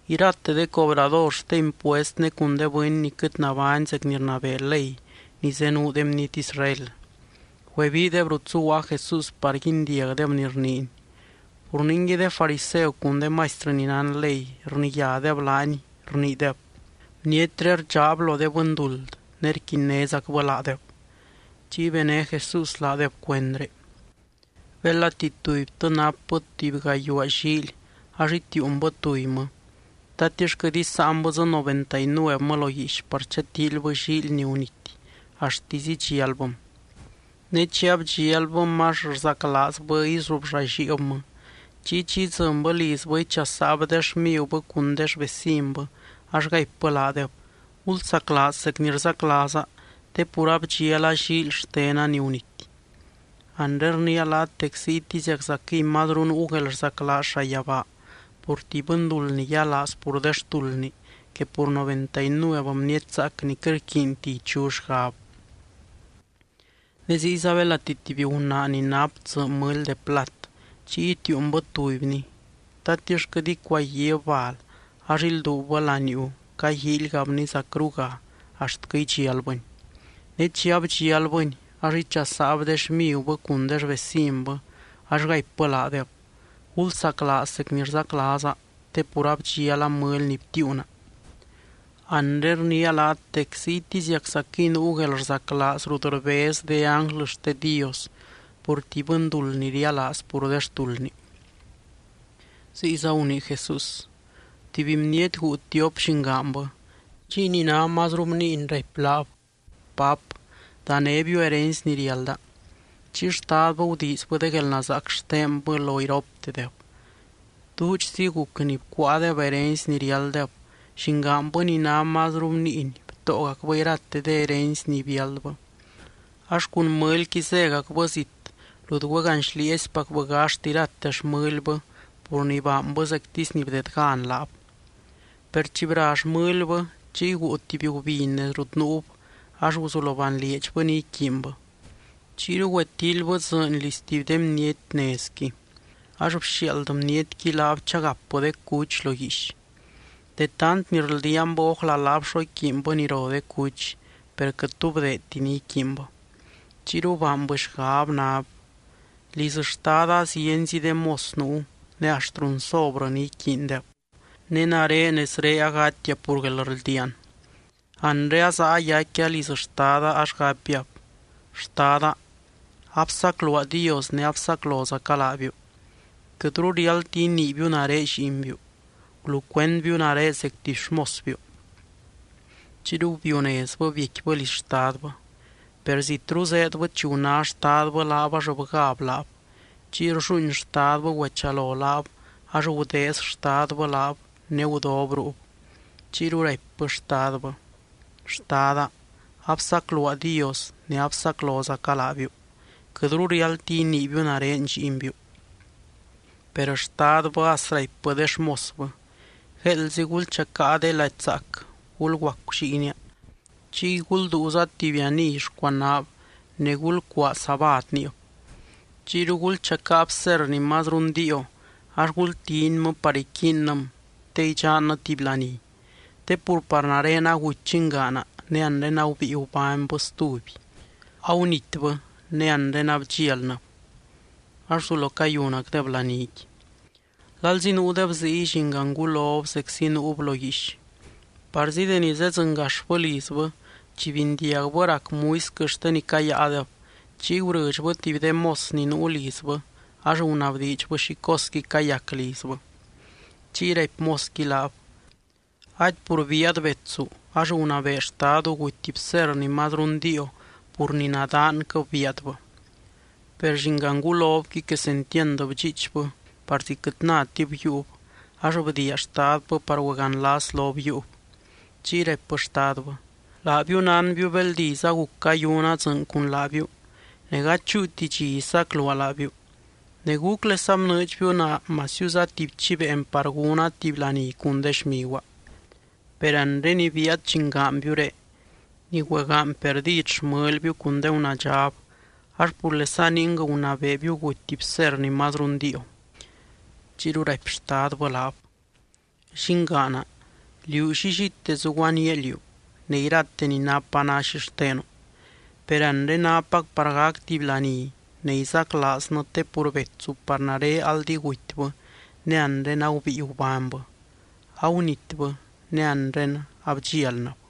Irate de cobrador xte impuest ne cun de bɨny ni quɨt nabány zec ni rnabee ley ni zenuu de bniety Israel, güebiideb rut zuguaa Jesús par guindiagdeb ni rniiny. Pur ningui, de fariseu cun de maistrɨ ni nán ley rniyádeb laany, rniideb: —Bnietré rdxaab lo de bɨnduld ne rquinnézacbɨ laadeb. Chiy bené Jesús laadeb cuendré: —Belati tubytɨ napbɨ tuby gayuaa llíily ax itiiunbɨ tubymɨ, ¿tatix quɨt isáanbɨ dzɨ noventa y nuevmɨ lo guiix par chatíilybɨ llíily ni gunity axtisy idxialbɨm? Ne chi abdxialbɨm ax rzaclaazbɨ izubllalliibmɨ. Chiy chi idzɨnbɨ lizbɨ, ichasaab de xmigubɨ cun de xvecinbɨ ax gaipbɨ laadeb: “Gulzaclaaz zec ni rzaclaaza te pur abdxiala llíily xtena ni gunity.” Anre rniia laat dec ziytiziaczaquɨy mazru nuu guelrzaclaaz llayabaa pur tuby bɨnduld ni yialaaz pur de xtuldni que pur noventa y nuev bniety zaac ni quɨt rquiinti ichu xgab. ’Ne ziyza belati tuby gunaa ni nap tsɨ mɨly de plat chiy itiiunbɨ tubyni, ¿tatix quɨt icuaguib bal ax ilduubbɨ laniuu caguíilgabni zacruga axtquɨ idxialbɨni? Ne chi abdxialbɨni ax ichasaab de xmigubɨ cun de xvecinbɨ ax gaipbɨ laadeb: “Gulsaclaaz zec ni rzaclaaza te pur abdxiala mɨly ni btiiuna.” Anre rniia laat dec ziytiziaczaquɨy nuu guelrzaclaaz rut rbez de ánglɨ xte Dios pur tuby bɨnduld ni rialaaz pur de xtuldni. Ziyza gunii Jesús: —Tuby bniety guu tiop llingaanbɨ. Chiy ni ná mazru bniiny raipy laab: “Pap, danébiu herency ni riálda.” Chiy xtadbɨ gudiizbɨ de guelnazaac xtenbɨ lo iroptedeb. Duudxzi guc ni cuáadeb herency ni riálddeb, llingaanbɨ ni ná mazru bniiny btóogacbɨ irate de herency ni biáldbɨ. Ax cun mɨlyqui zégacbɨ zit, rut güeganxlieezipacbɨ gaxt irate xmɨlbɨ pur ni baanbɨ zectisy ni bdedgan laab. Per chi bra xmɨlbɨ, chiy guu tuby gubiny nez rut nuub, ax guzulo banlieedxbɨ ni iquiinbɨ. Chiyru güetíilybɨ dzɨɨny liz tuby de bniety nezqui. Ax bxiaald bnietqui laab chagapbɨ de cuch lo guiix. De tant ni rldiaanbɨ ójla laab xo iquiinbɨ ni ro de cuch, per quɨt tu bdeedti ni iquiinbɨ. Chiyru baanbɨ xgab nab: “¡Liz xtada zienzi de mos nuu ne axt runsobrɨ ni iquiindeb, ne nare nezré agatia pur guelrldiaan! Anre azaa yaicquia liz xtada ax gapiab: Xtada, absacluaa Dios ne absaclozaca laabiu. Quɨtru riáldti iniibiu nare lliinbiu. Gulucuendbiu nare zec tuby xmosbiu.” Chiyru biunezbɨ biecquibɨ liz xtadbɨ. ’Per zitru zéedbɨ chi guná xtadbɨ laab ax bgáb laab. Chiy rlluuin xtadbɨ güechalo laab, ax gudeez xtadbɨ laab, ne gudob ruub. Chiyru raipbɨ xtadbɨ: “Xtada, absacluaa Dios ne absaclozaca laabiu. Quɨtru riáldti iniibiu nare lliinbiu.” Per xtadbɨ as raipbɨ de xmosbɨ: “Gueeldzi gulchacáa de lady zaac gulguacu lliinia, chiy gulduuza tuby aniy xcuanaab ne gulcuaa sabád niib. Chiyru gulchacáa bserr ni mazru ndiio ax gultinmɨ par iquiinnɨm te idxannɨ tuby laní. Te pur par nare aguty llingaana, ne anre agubíi gubánybɨ stuby. Agunitbɨ ne anre abdxialnɨb.” Ax guzulo cayunacdeb laníqui. ’Lalzi nuudeb ziy, llingangulob zeczi nuub lo guiix. Parzi deni zedzɨngaxbɨ lizbɨ, chi bindiagbɨ rac muisquɨ xte ni cayáadeb, chiy gurɨdxbɨ tuby de mos ni nuu lizbɨ ax gunabdiidxbɨ xi cosqui cayac lizbɨ. Chiy raipy mosqui laab: “Ady pur bíaad betsu ax gunabee xtadu guty bserr ni mazru ndiio pur nadaanquɨb bíaadbɨ.” Per llingangulobqui quesentiand bdxiichbɨ parzi quɨt nátib yiiub ax bdiia xtadbɨ par güeganlas lob yiiub. Chiy raipbɨ xtadbɨ: “Laabiu nánbiu beld iz aguc cayuna dzɨɨny cun laabiu ne gady chúuti dxi isacluaa laabiu ne, ¿gúclesa bnɨɨdxbiu naa masiuza tuby chiveen par gúna tuby laní cun de xmiguaa? Per anre ni bíaad llingaanbiuré, ni güegaany perdid xmɨlbiu cun de gunaadxab ax purlesa ning gunabeebiu guty bserr ni mazru ndiio.” Chiyru raipy xtadbɨ laab: “Llingaana, liú llillite zuguaníaa liú ne irate ni napa ná xixtenu. Per anre nápac par gac tuby laní ne izaclaaznɨ te pur betsu par nare aldi gutybɨ ne anre agubíi gubánybɨ. Agunitbɨ ne anre abdxialnɨb.”